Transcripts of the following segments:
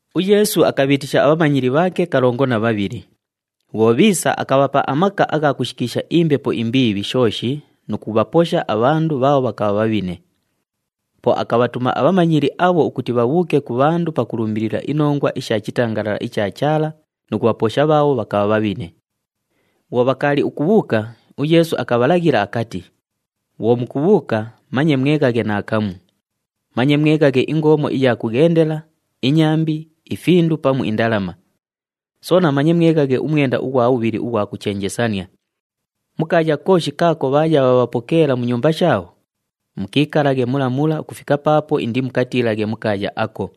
UYeesu akabhiitisha abhamanyili bhaake kalongo na bhabhili. Bhwo bhiisa, akabhapa amaka agha kushikiisha imbepo imbiibhi shooshi nu kubhaposha abhandu bhaabho bhakabha bhabhine. Po akabhatuma abhamanyili abho ukuti bhabhuuke ku bhandu pakulumbilila inongwa isha chitangalala icha Chaala nu kubhaposha bhaabho bhakabha bhabhine. Bhwo bhakaali ukubhuuka, uYeesu akabhalaghila akati, “Bhwo mukubhuuka, manye mweghaghe naakamu. Manye mweghaghe ingoomo iya kughendela, inyambi, ifindu pamu indalama. Soona manye mweghaghe umwenda ughwa bhubhili ughwa kuchenjesania. Mu kaaya kooshi kaako bhaaya bhaabhapokeela mu nyumba shaabho, mukiikalaghe mula mula ukufika paapo indimukatiilaghe mu kaaya ako.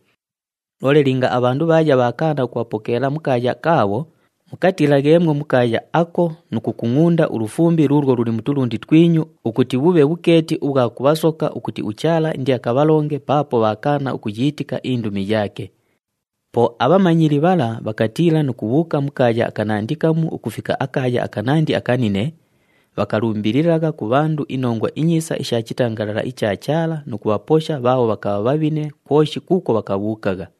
Loole linga abhandu bhaaya bhaakaana ukubhapokeela mu kaaya kaabho, mukatiilagheemwo mu kaaya ako nu kukungʼunda ulufumbi luulwo luli mu tulundi twinyu, ukuti bhubhe bhukeeti ubhwa kubhasoka ukuti uChaala indiakabhalonge, paapo bhaakaana ukuyiitika indumi yaake.” Po abhamanyili bhala bhakatiila nu kubhuuka mu kaaya akanandi kamu ukufika akaaya akanandi akanine, bhakalumbililagha ku bhandu iNongwa iNyiisa isha chitangalala icha Chaala nu kubhaposha bhaabho bhakabha bhabhine kwoshi kuukwo bhakabhuukagha.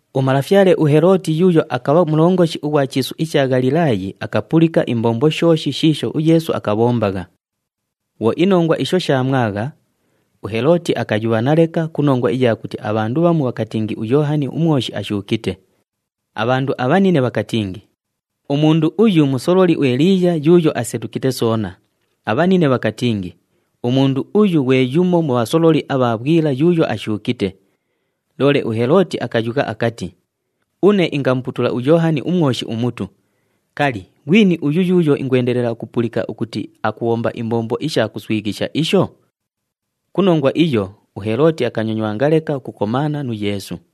Umalafyale uHelooti yuuyo akabha mulongoshi ughwa chiisu icha Ghalilaayi akapulika imbombo shooshi shiisho uYeesu akabhombagha. Bhwo inongwa isho shaamwagha, uHelooti akayubhana leka ku nongwa iya kuti abhandu bhamu bhakatingi uYoohani uMwoshi ashuukite. Abhandu abhanine bhakatingi, “Umundu uyu musololi uEliiya yuuyo asetukite soona.” Abhanine bhakatingi, “Umundu uyu ghwe yumo mu bhasololi abha bhwila yuuyo ashuukite.” Loole uHelooti akayugha akati, “Une ingamuputula uYoohani uMwoshi umutu, kali, ghwini uyu yuuyo ingwendelela ukupulika ukuti akubhomba imbombo isha kuswighisha isho?” Ku nongwa iyo, uHelooti akanyonywanga leka ukukomaana nu Yeesu.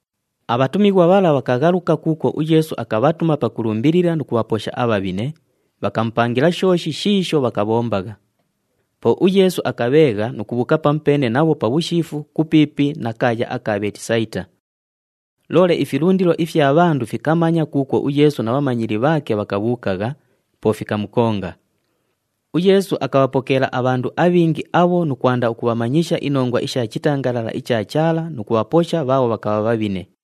Abhatumighwa bhala bhakaghaluka kuukwo uYeesu akabhatuma pakulumbilila nu kubhaposha abhabhine, bhakamupangila shooshi shiisho bhakabhombagha. Po uYeesu akabheegha nu kubhuuka pamupeene nabho pabhushiifu kupiipi na kaaya aka Bheetisayita. Loole ifilundilo ifya bhandu fikamanya kuukwo uYeesu na bhamanyili bhaake bhakabhuukagha, po fikamukonga. UYeesu akabhapokeela abhandu abhingi abho nu kwanda ukubhamanyisha inongwa isha chitangalala icha Chaala nu kubhaposha bhaabho bhakabha bhabhine.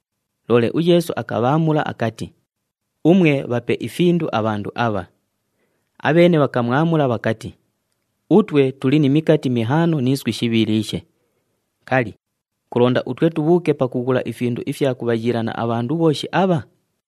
Loole uYeesu akabhaamula akati, “Umwe, bhape ifindu abhandu abha.” Abheene bhakamwamula bhakati, “Utwe tuli ni mikati mihaano ni iswi shibhiliishe. Kali, kulonda utwe tubhuuke pakughula ifindu ifya kubhayiilania abhandu bhooshi abha?”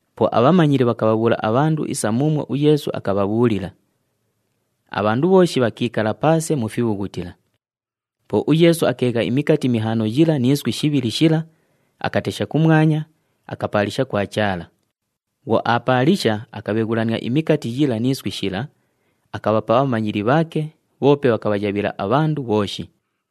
Po abhamanyili bhakabhabhuula abhandu isa muumwo uYeesu akabhabhuulila. Abhandu bhooshi bhakiikala paase mu fibhughutila. Po uYeesu akeegha imikati mihaano yila ni iswi shibhili shila, akatesha kumwanya, akapaalisha kwa Chaala. Bhwo aapaalisha, akabheghulania imikati yila ni iswi shila, akabhapa abhamanyili bhaake, bhoope bhakabhayabhila abhandu bhooshi.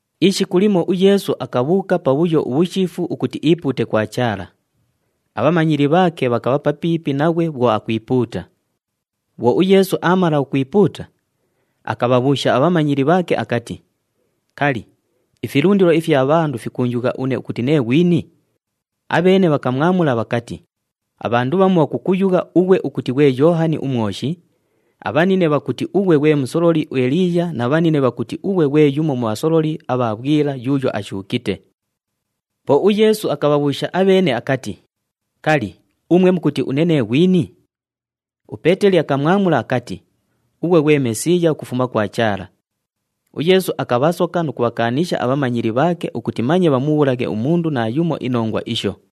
Ishiku limo uYeesu akabhuuka pabhuyo ubhushiifu ukuti iipuute kwa Chaala. Abhamanyili bhaake bhakabha papiipi naghwe bhwo akwipuuta. Bhwo uYeesu aamala ukwipuuta, akabhabhuusha abhamanyili bhaake akati, “Kali, ifilundilo ifya bhandu fikuunjugha une ukuti nee ghwini?” Abheene bhakamwamula bhakati, “Abhandu bhamu bhakukuyugha ughwe ukuti ghwe Yoohani uMwoshi, abhanine bhakuti ughwe ghwe musololi uEliiya na bhanine bhakuti ughwe ghwe yumo mu bhasololi abha bhwila yuuyo ashuukite.” Po uYeesu akabhabhuusha abheene akati, “Kali, umwe mukuti une nee ghwini?” UPeeteli akamwamula akati, “Ughwe ghwe Mesiiya ukufuma kwa Chaala!” UYeesu akabhasoka nu kubhakaanisha abhamanyili bhaake ukuti manye bhamubhuulaghe umundu naayumo inongwa isho.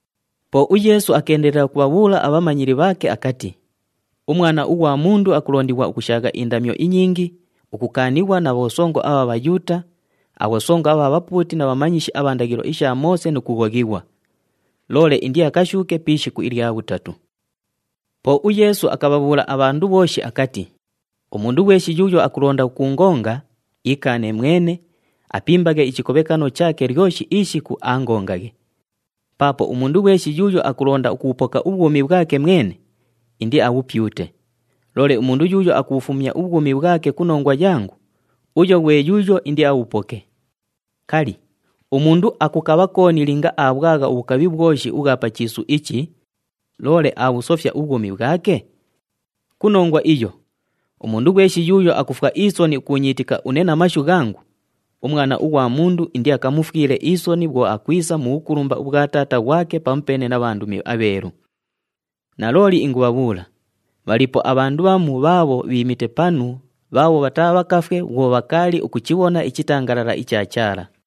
Po uYeesu akeendelela ukubhabhuula abhamanyili bhaake akati, “UMwana ughwa Mundu akulondighwa ukushaagha indamyo inyingi, ukukaanighwa na bhosongo abha Bhayuuta, abhosongo abha bhapuuti na bhamanyishi abha ndaghilo isha Moose nu kughoghighwa. Loole indiakashuuke pi ishiku ilya bhutatu.” Po uYeesu akabhabhuula abhandu bhooshi akati, “Umundu ghweshi yuuyo akulonda ukuungonga, iikaane mwene, apimbaghe ichikobhekano chaake lyoshi ishiku, aangongaghe. Paapo umundu ghweshi yuuyo akulonda ukubhupoka ubhwumi bhwake mwene, indiabhupyute. Loole umundu yuuyo akubhufumya ubhwumi bhwake ku nongwa yangu, uyo ghwe yuuyo indiabhupoke. Kali, umundu akukabha kooni linga aabhwagha ubhukabhi bhwoshi ubhwa pa chiisu ichi, loole aabhusofya ubhwumi bhwake? Ku nongwa iyo, umundu ghweshi yuuyo akufwa isoni ukuunyiitika une na mashu ghangu, uMwana ughwa Mundu indiakamufwile isoni bhwo akwisa nu bhukulumba ubhwa Taata ghwake pamupeene na bhandumi abheelu. Nalooli ingubhabhuula, bhaliipo abhandu bhamu bhaabho bhiimite panu bhaabho bhataabhakafwe bhwo bhakaali ukuchibhona ichitangalala icha Chaala.”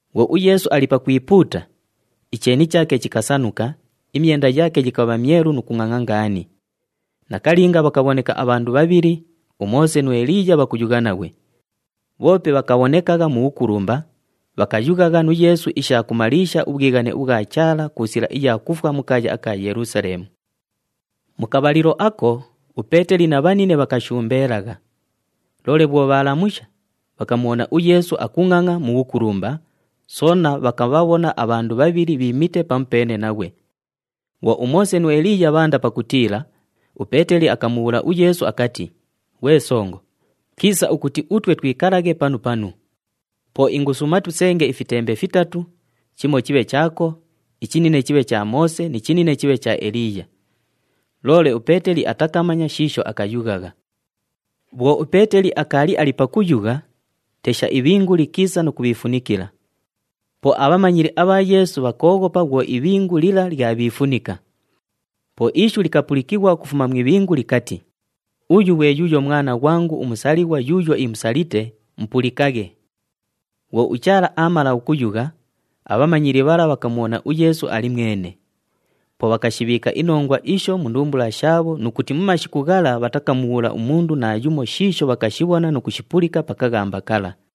Bhwo uYeesu ali pakwipuuta, icheeni chaake chikasanuka, imyenda yaake yikabha myelu nu kungʼangʼa ngaani. Nakalinga bhakabhoneka abhandu bhabhili, uMoose nu Eliiya bhakuyugha naghwe. Bhoope bhakabhonekagha mu bhukulumba, bhakayughagha nu Yeesu isha kumaliisha ubhwighane ubhwa Chaala ku sila iya kufwa mu kaaya aka Yelusaleemu. Mu kabhalilo ako, uPeeteli na bhanine bhakashumbeelagha. Loole bhwo bhaalamusha, bhakamubhona uYeesu akungʼangʼa mu bhukulumba, soona bhakabhabhona abhandu bhabhili bhiimite pamupeene naghwe. Bhwo uMoose nu Eliiya bhaanda pakutiila, uPeeteli akamubhuula uYeesu akati, “Ghwe Songo, kiisa ukuti utwe twikalaghe panu panu. Po ingusuuma tusenge ifitembe fitatu, chimo chibhe chaako, ichinine chibhe cha Moose ni chinine chibhe cha Eliiya.” Loole uPeeteli atakamanya shiisho akayughagha. Bhwo uPeeteli akaali ali pakuyugha, tesha, ibhingu likiisa nu kubhiifunikila. Po abhamanyili abha Yeesu bhakooghopa bhwo ibhingu lila lyabhiifunika. Po ishu likapulikighwa ukufuma mu ibhingu likati, “Uyu ghwe yuuyo Mwana ghwangu umusalighwa yuuyo imusalite, mupulikaghe!” Bhwo uChaala aamala ukuyugha, abhamanyili bhala bhakamubhona uYeesu ali mwene. Po bhakashibhiika inongwa isho mu ndumbula shaabho nu kuti mu mashiku ghala bhatakamubhuula umundu naayumo shiisho bhakashibhona nu kushipulika pa kaghamba kala.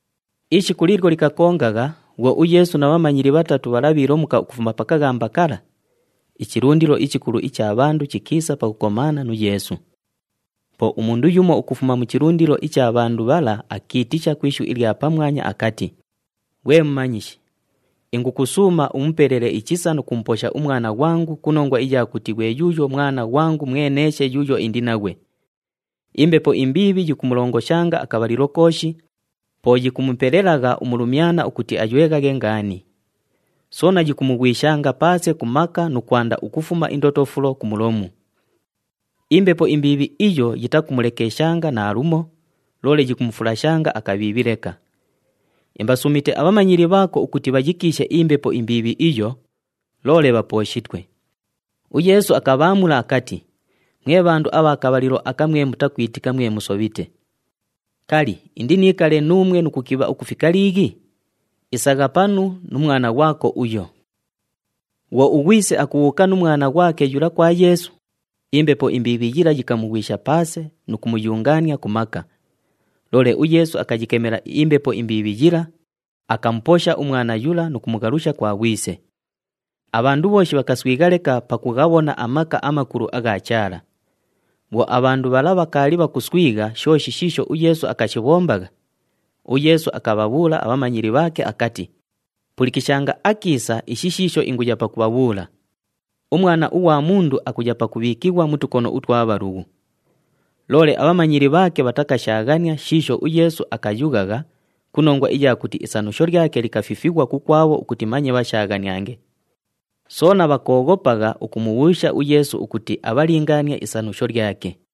Ishiku liilyo likakongagha, bhwo uYeesu na bhamanyili bhatatu bhala bhiilomuka ukufuma pa kaghamba kala, ichilundilo ichikulu icha bhandu chikiisa pakukomaana nu Yeesu. Po umundu yumo ukufuma mu chilundilo icha bhandu bhala akiitisha ku ishu ilya pamwanya akati, “Ghwe Mumanyishi, ingukusuuma umupelele ichisa nu kumuposha umwana ghwangu ku nongwa iya kuti ghwe yuuyo mwana ghwangu mweneeshe yuuyo indi naghwe. Imbepo imbiibhi yikumulongoshanga akabhalilo kooshi, po yikumupelelagha umulumyana ukuti ayweghaghe ngaani. Soona yikumughwishanga paase ku maka nu kwanda ukufuma indotofulo ku mulomu. Imbepo imbiibhi iyo yitakumulekeshanga naalumo, loole yikumufulashanga akabhiibhi leka. Imbasuumite abhamanyili bhaako ukuti bhayikiishe imbepo imbiibhi iyo, loole bhapooshitwe.” UYeesu akabhaamula akati, “Mwe bhandu abha kabhalilo aka mwe mutakwitika, mwe musobhite. Kali, indiniikale nuumwe nu kukibha ukufika liighi? Isagha panu nu mwana ghwako uyo!” Bhwo ughwise akubhuuka nu mwana ghwake yula kwa Yeesu, imbepo imbiibhi yila yikamughwisha paase nu kumuyungaania ku maka. Loole uYeesu akayikemela imbepo imbiibhi yila, akamuposha umwana yula nu kumughalusha kwa ghwise. Abhandu bhooshi bhakaswigha leka pakughabhona amaka amakulu agha Chaala. Bhwo abhandu bhala bhakaali bhakuswigha shooshi shiisho uYeesu akashibhombagha, uYeesu akabhabhuula abhamanyili bhaake akati, “Pulikishanga akiisa ishi shiisho inguya pakubhabhuula! UMwana ughwa Mundu akuya pakubhiikighwa mu tukono utwa bhalughu.” Loole abhamanyili bhaake bhatakashaaghania shiisho uYeesu akayughagha ku nongwa iya kuti isanusho lyake likafifighwa kukwabho ukuti manye bhashaaghaniange. Soona bhakooghopagha ukumubhuusha uYeesu ukuti abhalingaanie isanusho lyake.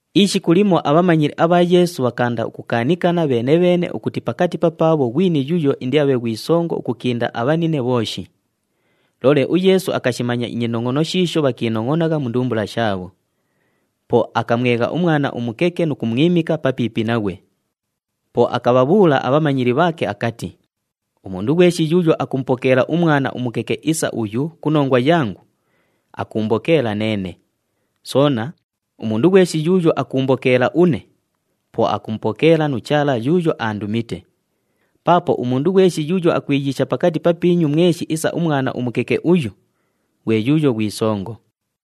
Ishiku limo abhamanyili abha Yeesu bhakaanda ukukaanikana bheene-bheene ukuti pakati papaabho ghwini yuuyo indiabhe ghwi songo ukukinda abhanine bhooshi. Loole uYeesu akashimanya inyinongʼono shiisho bhakiinongʼonagha mu ndumbula shaabho. Po akamwegha umwana umukeke nu kumwimika papiipi naghwe. Po akabhabhuula abhamanyili bhaake akati, “Umundu ghweshi yuuyo akumupokeela umwana umukeke isa uyu ku nongwa yangu, akuumbokeela neene. Soona, umundu ghweshi yuuyo akuumbokeela une, po akumupokeela nu Chaala yuuyo aandumite. Paapo umundu ghweshi yuuyo akwiyiisha pakati papiinyu mweshi isa umwana umukeke uyu, ghwe yuuyo ghwi songo.”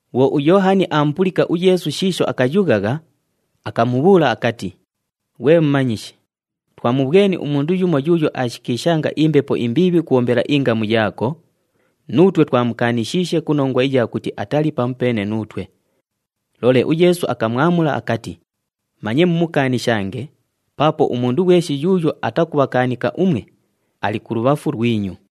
Bhwo uYoohani aamupulika uYeesu shiisho akayughagha, akamubhuula akati, “Ghwe Mumanyishi, twamubhweni umundu yumo yuuyo aashikiishanga imbepo imbiibhi ukubhombela ingamu yaako, nuutwe twamukaanishiishe ku nongwa iya kuti atali pamupeene nuutwe.” Loole uYeesu akamwamula akati, “Manye mumukaanishange paapo umundu ghweshi yuuyo atakubhakaanika umwe, ali kulubhafu lwinyu.”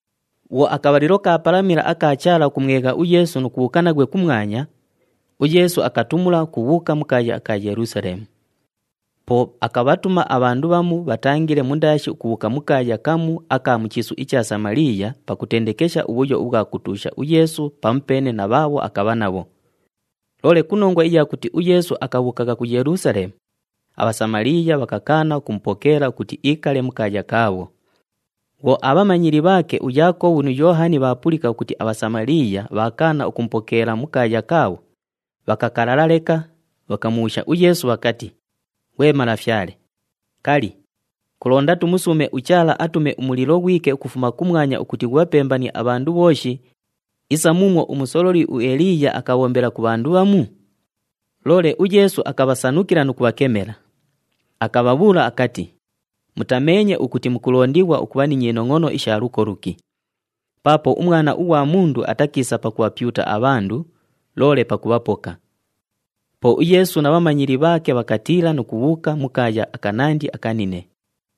Bhwo akabhalilo kaapalamila aka Chaala ukumwegha uYeesu nu kubhuuka naghwe kumwanya, uYeesu akatumula ukubhuuka mu kaaya aka Yelusaleemu. Po akabhatuma abhandu bhamu bhatangile mundaashi ukubhuuka mu kaaya kamu aka mu chiisu icha Samaliiya pakutendekesha ubhuyo ubhwa kutuusha uYeesu pamupeene na bhaabho akabha nabho. Loole ku nongwa iya kuti uYeesu akabhuukagha ku Yelusaleemu, aBhasamaliiya bhakakaana ukumupokeela ukuti iikale mu kaaya kaabho. Bhwo abhamanyili bhaake uYaakobhu nu Yoohani bhaapulika ukuti aBhasamaliiya bhaakaana ukubhapokeela mu kaaya kaabho, bhakakalala leka, bhakamubhuusha uYeesu bhakati, “Ghwe Malafyale, kali, kulonda tumusuume uChaala atume umulilo ghwike ukufuma kumwanya ukuti ghubhapembanie abhandu bhooshi [isa muumwo umusololi uEliiya akabhombela ku bhandu bhamu]?” Loole uYeesu akabhasanukila nu kubhakemela. [Akabhabhuula akati, “Mutameenye ukuti mukulondighwa ukubha ni nyinongʼono isha luko luki.] Paapo uMwana ughwa Mundu atakiisa pakubhapyuta abhandu loole pakubhapoka.” Po uYeesu na bhamanyili bhaake bhakatiila nu kubhuuka mu kaaya akanandi akanine.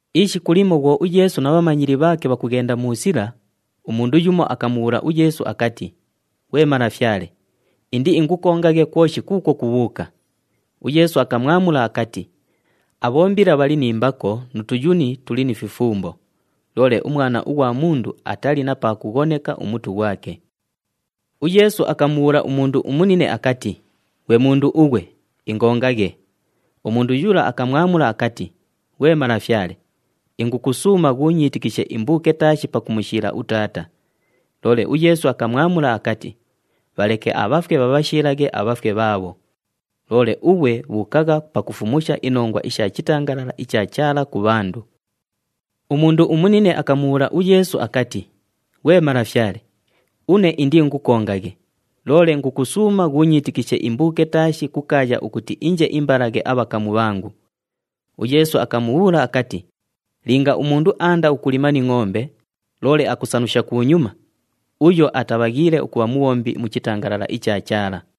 Ishiku limo bhwo uYeesu na bhamanyili bhaake bhakughenda mu sila, umundu yumo akamubhuula uYeesu akati, “Ghwe Malafyale, indiingukongaghe kwoshi kuukwo kubhuuka!” UYeesu akamwamula akati, “Abhombila bhali ni mbako nu tuyuni tuli ni fifumbo, loole uMwana ughwa Mundu atali na pa kughoneka umutu ghwake!” UYeesu akamubhuula umundu umunine akati, “Ghwe mundu ughwe, ingongaghe!” Umundu yula akamwamula akati, “Ghwe Malafyale, ingukusuuma ghuunyiitikishe imbuuke taashi pakumushiila utaata.” Loole uYeesu akamwamula akati, “Bhaleke abhafwe bhabhashiilaghe abhafwe bhaabho. Loole ughwe bhuukagha pakufumusha inongwa isha chitangalala icha Chaala ku bhandu.” Umundu umunine akamubhuula uYeesu akati, “Ghwe Malafyale, une indiingukongaghe, loole ingukusuuma ghuunyiitikishe imbuuke taashi kukaaya ukuti inje imbalaghe abhakamu bhangu.” UYeesu akamubhuula akati, “Linga umundu aanda ukulima ni ngʼombe, loole akusanusha kunyuma, uyo atabhaghiile ukubha mubhombi mu chitangalala icha Chaala.”